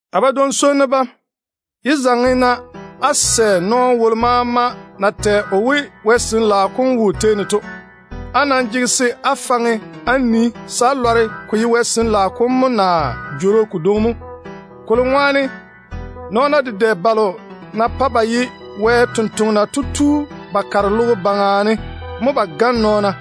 A badwoŋ-swonnu bam, yé zaŋe-na á sɛ nɔɔno wolo maama na tɛ o we, Wɛ Sin-laao kom wo o tei ne to. Á nam jege se á faŋe á nii se á lɔre ko ye Wɛ Sin-laao kom mo, naa jworo kodwoŋi mo, kolo ŋwaane nɔɔna dedɛ balo na pae ba ye Wɛ sampwori to tu ba kare logo baŋa ne mo ba gane nɔɔna.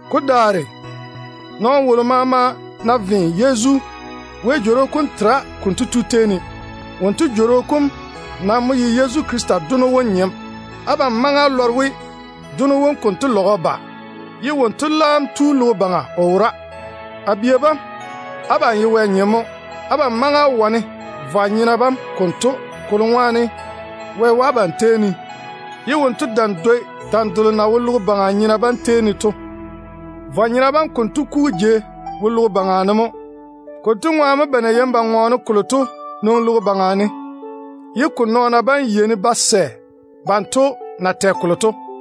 Ko daare nɔɔno wolo maama ná ve Yezu, Wɛ Jworo kom tera konto tu tei ne. Wonto jworo kom nam mo ye Yezu Krista Dono wom nyem. Abam maŋe á lɔre we, Dono wom konto lage o ba logo baŋa. Leile konto o laam maŋe o ba o wora. A bia bam, abam ye Wɛ nyem mo. Abam maŋe á wane vwa-nyena bam konto, kolo ŋwaane Wɛ wo abam tei ne, ye wonto dam dwoi dam delo na wo logo baŋa nyena bam tei ne to. Vwa-nyena bam konto kugu jei wo logo baŋa ne mo. Konto ŋwaane mo ba na yeini ba ŋɔɔne kolo to nwoŋi logo baŋa ne, ye ko nɔɔna bam yeini ba sɛ banto na tɛ kolo to.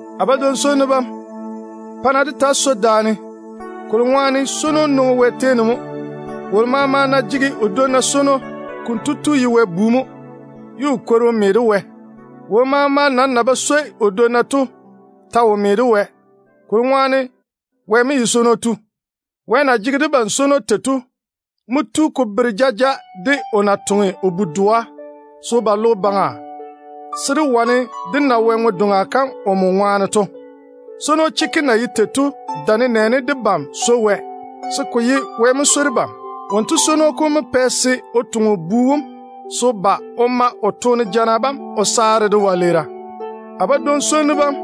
A badwoŋ-swonnu bam, pa-na dé taa swoi daane, kolo ŋwaane swono nwoŋi Wɛ tei ne mo. Wolo maama ná jege o dwonna swono, konto tu ye Wɛ bu mo, ye o kwori o me de Wɛ. Wolo maama nam na ba swoi o dwonna to ta wo me de Wɛ, kolo ŋwaane Wɛ mo ye swono tu. Wɛ na jege debam swono tei to mo tu ko bere jaja de o na toŋe o Bu-doa se o ba logo baŋa, se dé wane dé na Wɛ ŋwe-doŋa kam omo ŋwaane to. Swono chekke na ye tei to mo tento: Ko dae nenɛɛne debam mo swoi Wɛ, ko ye Wɛ mo swoi debam. Wonto swono kom mo pɛ o toŋe o Bu wom se o ba o te o ma o toone jana bam o saare dé wɛleera. A badwoŋ-swonnu bam,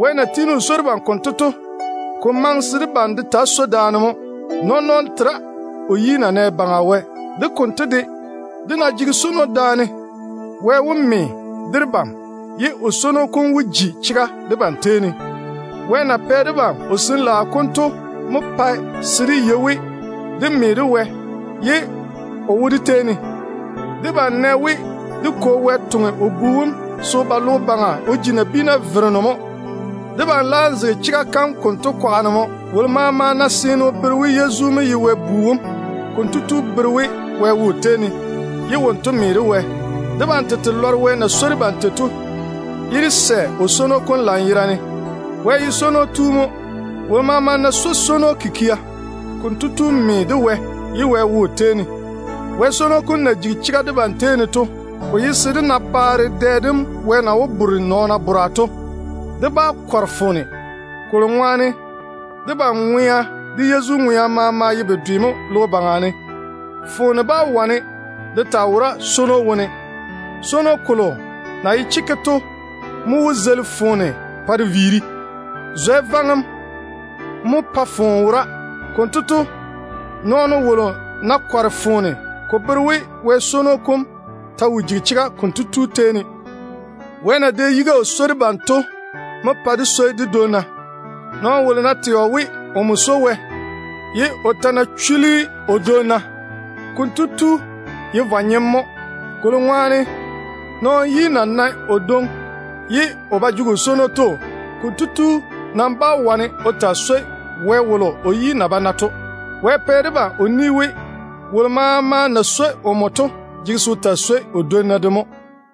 Wɛ na tiini o swoi debam konto to, ko maŋe se debam de taa swoi daane mo. Nɔɔn-nɔɔno tera o yi na nɛ Baŋa Wɛ. De konto de, dé ná jege da-swono, Wɛ wó me de debam, ye o swono kom wó ji chega debam tei ne. Wɛ na pɛ debam o Sin-laao kom to mo pae se dé yei we dé me de Wɛ, ye o wo dé tei ne. Debam nɛ we, dé Kwo Wɛ toŋe o Bu wom se o ba logo baŋa o ji nabiina Vereno mo. Debam laam zege chega kam konto kwaga ne mo. Wolo maama ná seene o bere we Yezu mo ye Wɛ Bu wom, konto tu bere we Wɛ wo o tei ne, ye wonto me de Wɛ. Debam tete lɔre Wɛ na swoi debam tei to, ye dé sɛ o swono kom lanyerane. Wɛ ye swono tu mo. Wolo maama ná swoi swono kikia, konto tu me de Wɛ, ye Wɛ wo o tei ne. Wɛ swono kom na jigi chega debam tei ne to, ko ye se dé na baare dɛ dem Wɛ na wó bore nɔɔna bora to. Dé bá kɔre foone, kolo ŋwaane debam ŋwea de Yezu ŋwea maama ye bedwe mo logo baŋa ne. Foone bá wane de taa wora swono wone. Swono kolo na ye chekke to mo wó zeili foone pa de viiri. Zwɛ vaŋem mo pae foone wora. Konto to, nɔɔno wolo ná kɔre foone, ko bere we Wɛ swono kom ta wo jigi chega konto tu tei ne. Wɛ na dɛ yiga o swoi debam to mo pae dé swoi dé dwonna. Nɔɔno wolo ná tɛ o we, omo swoi Wɛ, ye o ta ná chuli o dwonna, konto tu ye vwa-nyem mo. Kolo ŋwaane, nɔɔno wolo yi na nae o dwoŋi ye o ba jege o swono to, konto tu nam bá wane o taa swoi Wɛ wolo o yi na ba nae to. Wɛ pɛ debam o ni we, wolo maama na swoi omo to jege se o taa swoi o dwonna de mo.